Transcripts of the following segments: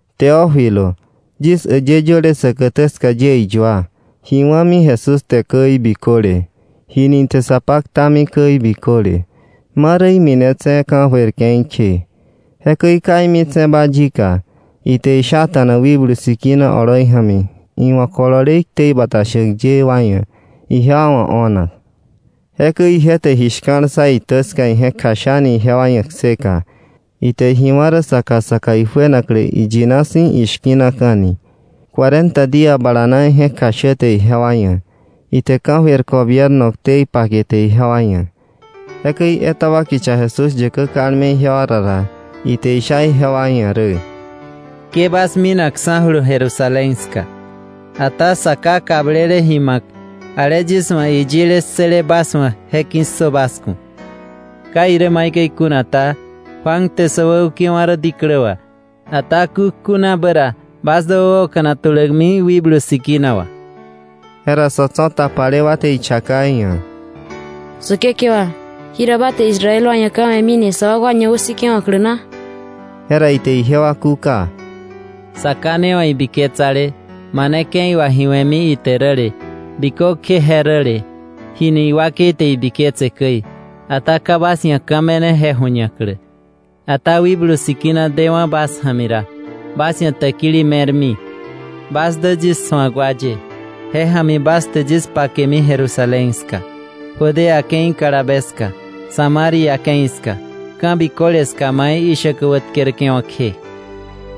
Teófilo, yis äyë yöle säkätä ska yie iyua, ji wa̱mi Jesús te käi biköle, jini ite sa paktami käi biköle, ma rä iminetse̱ ka̱jöir ke̱i kje. Jekäi ka imitse̱ba yika, ite ji shata̱na Wikblu Sikina oloi ja̱mi iwa̱ kolole iktei bata shäk ye wa ia̱ ijewa wa̱ o̱nak. Jekäi ije te ji shka̱l ssa itä ska ije̱k kjashani ijewa ia̱ kseka, ite ji wá̱ rä saka saka ijuenaklä iyina si̱ ishki̱naka̱ni. Cuarenta día bala na ije̱k kjashäte ijewa ia̱, ite ka̱jöir gobierno ktei pakete ijewa ia̱. Jekäi etaba kicha Jesús yäkä kalme ijewa ra ra, ite isha ijewa ia̱ rä: “Ke bas minakksa̱julu Jerusalén ska, ata Sa Ká kablele ji ma̱k, ale yis wa̱ iyile ssële bas wa̱ je ki̱ssö bas ku̱. Ka irä maikäi kuna ta, Juan te sä wäukewa̱ rä diklä wà, ata kukjunabä ra bas dä wäoka̱nak tulämi Wikblu Sikina wà.” Jera sa̱ tso̱ tapale wa te ichaka iia̱: —Säkekewa, ¿jira ba te Israel wa ia̱ ka̱ me̱mini sa wakwa ñawäsikewa̱klä na? Jera ite ijewa kúka: —Sa Ká ne wa̱ ibiketsale mane ke̱i wà ji we̱mi ite räle bikökje je räle jini iwakei te ibiketse käi, ata ka bas ia̱ ka̱ me̱ne je ju̱ñaklä. Ata Wikblu Sikina dewa̱ bas ja̱mi ra, bas ia̱ täkili me̱rmi. Bas dä yis su̱ak wa ye, je ja̱mi bas te yis pakemi Jerusalén ska, Judea ke̱i kalabe ska, Samaria ke̱i ska, ka̱ biköle ska mai ishäkä wätkerke̱wa̱ kje.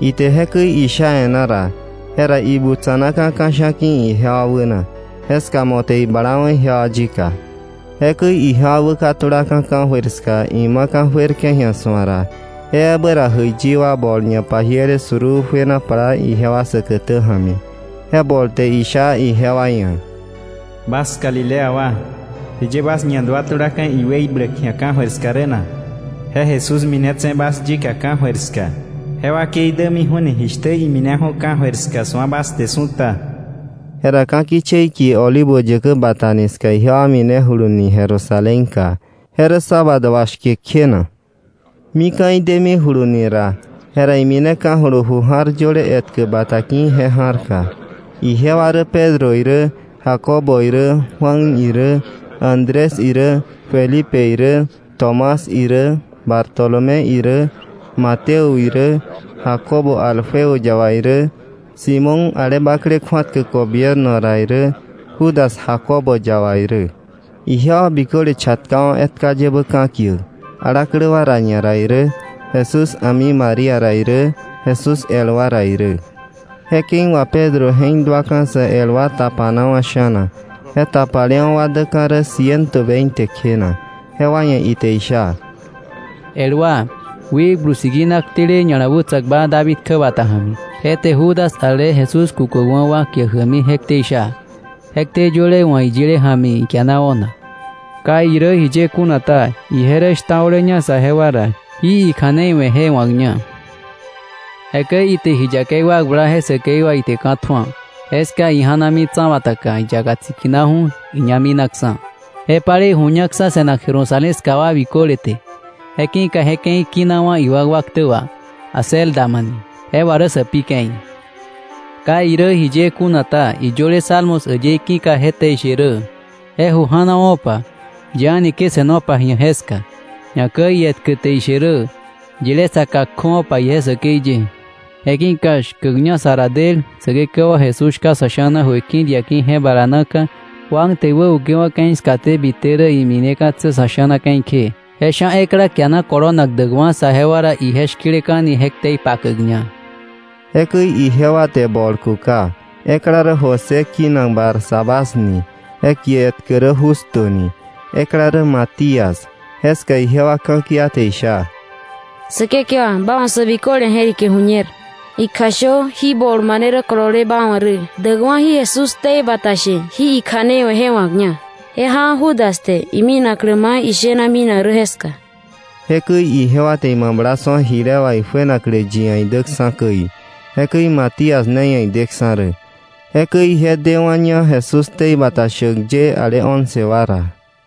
Ite jekäi isha e̱ná ra, jera ibutsa̱naka̱ ka̱sha̱ ki̱ ijewa wäna. Jeska mo̱ te iblawa̱ ijewa yika. Jekäi ijewa wäkatulaka̱ ka̱jöir ska imaka̱ juerke̱ ji̱a su̱ak ra, je ebä ra jäiyi wa bol ñapajiele suruu juena plaa ijewa säkätä ja̱mi. Je bol te isha ijewa ia̱: —Bas galilea wa, ¿jiye bas ñaduatulaka̱ iweibläk ji̱a ka̱jöir ska rä na? Je Jesús minetse̱ bas yika ka̱jöir ska, je wakei dämiju̱ni jishtä imineju̱ ka̱jöir ska su̱a bas te su̱ta. Jera ka̱ kichei kie Olivo Yäkä Bata ni ska ijewa minejuluni Jerusalénka. Je rä sábado wà shke kjena. Mika̱ idemijuluni ra, jera imineka̱julu ju ja̱r yöle ietkä bata ki̱ je ja̱rka. Ijewa rä Pedro irä, Jacobo irä, Juan irä, Andrés irä, Felipe irä, Tomás irä, Bartolomé irä, Mateo irä, Jacobo Alfeo yaba irä, Simón ale bakle kju̱atkäk gobierno ra irä, Judas Jacobo yaba irä. Ijewa biköle chatkawa̱ etka yebä ka̱kiäk, alaklä wa ra ñara irä, Jesús a̱mi María ra irä, Jesús el wa ra irä. Je ke̱i wà Pedro je̱k duaka̱ sä el wa tapanawa̱ sha̱na, je tapalewa̱ wa däka̱ rä ciento veinte kjena. Jewa ia̱ ite isha: “El wa, Wikblu Sikina ktele ña̱la wätsa̱kba David kjäbata ja̱mi, je te Judas ale Jesús kukäkwa̱ wa kiäk jämi je ktei sha, je ktei yöle wa̱ iyile ja̱mi ikiana o̱nak. Ka irä jiye kuna ta, ije rä shtao̱leña saje wa ra, jí ikja̱nei we̱ je wa̱kña. Jekäi ite ji yakei wakbla je säkei wà ite ka̱ tju̱a. Jeska ija̱nami tsa̱bataka, iyaka tsikinaju̱, iñá minaksa̱. Je palei ju̱ñaksa̱ se̱nak Jerusalén ska wa biköle te. Je ki̱ka je ke̱i kinawa̱ iwakwa ktä wà Acéldama ni. Je wà rä sä Pi Ke̱i. Ka irä jiye kuna ta, iyöle Salmos äyëí ki̱ka je te ishe rä: ‘Je ju janowo̱pa. Yi a̱ni ke se̱nopa ji̱a jeska.’ Ñakäi ietkä te ishe rä: ‘Yilé saka kjöwa̱pa ije säkei ye.’ “Je ki̱ka shkäkña sa ra del Säkekewa Jesús shka sa̱ sha̱na jöiki̱ diaki̱ je bala naka, Juan te iwäukewa̱ ke̱i skaté bite rä imineka̱tse̱ sa̱ sha̱na ke̱i kje, je sha̱ ekla kiana kolonak däkwa̱ saje wa ra ije shki̱leka̱ni je ktei pakäkña.” Jekäi ijewa te bol kuka. Ekla rä José, kinak Barsabás ni. Je kie etkä rä Justo ni. Ekla rä Matías. Jeska ijewa ka̱kia te isha: “Säkekewa, ba wa̱ sä biköle je̱rike ju̱ñer. Ikjashö jí bol mane rä kolole ba wa̱ rä däkwa̱ jí Jesús ktei bata she jí ikja̱nei we̱ je wa̱kña. Je jawa̱ Judas te iminaklä mai ije shena minak rä jeska.” Jekäi ijewa te imabla su̱a jile wà ijuenaklä yi ia̱ idäksa̱ käi. Jekäi Matías ne ia̱ ideksa̱ rä. Jekäi ije dewa̱ña Jesús ktei bata shäk ye ale once wa ra.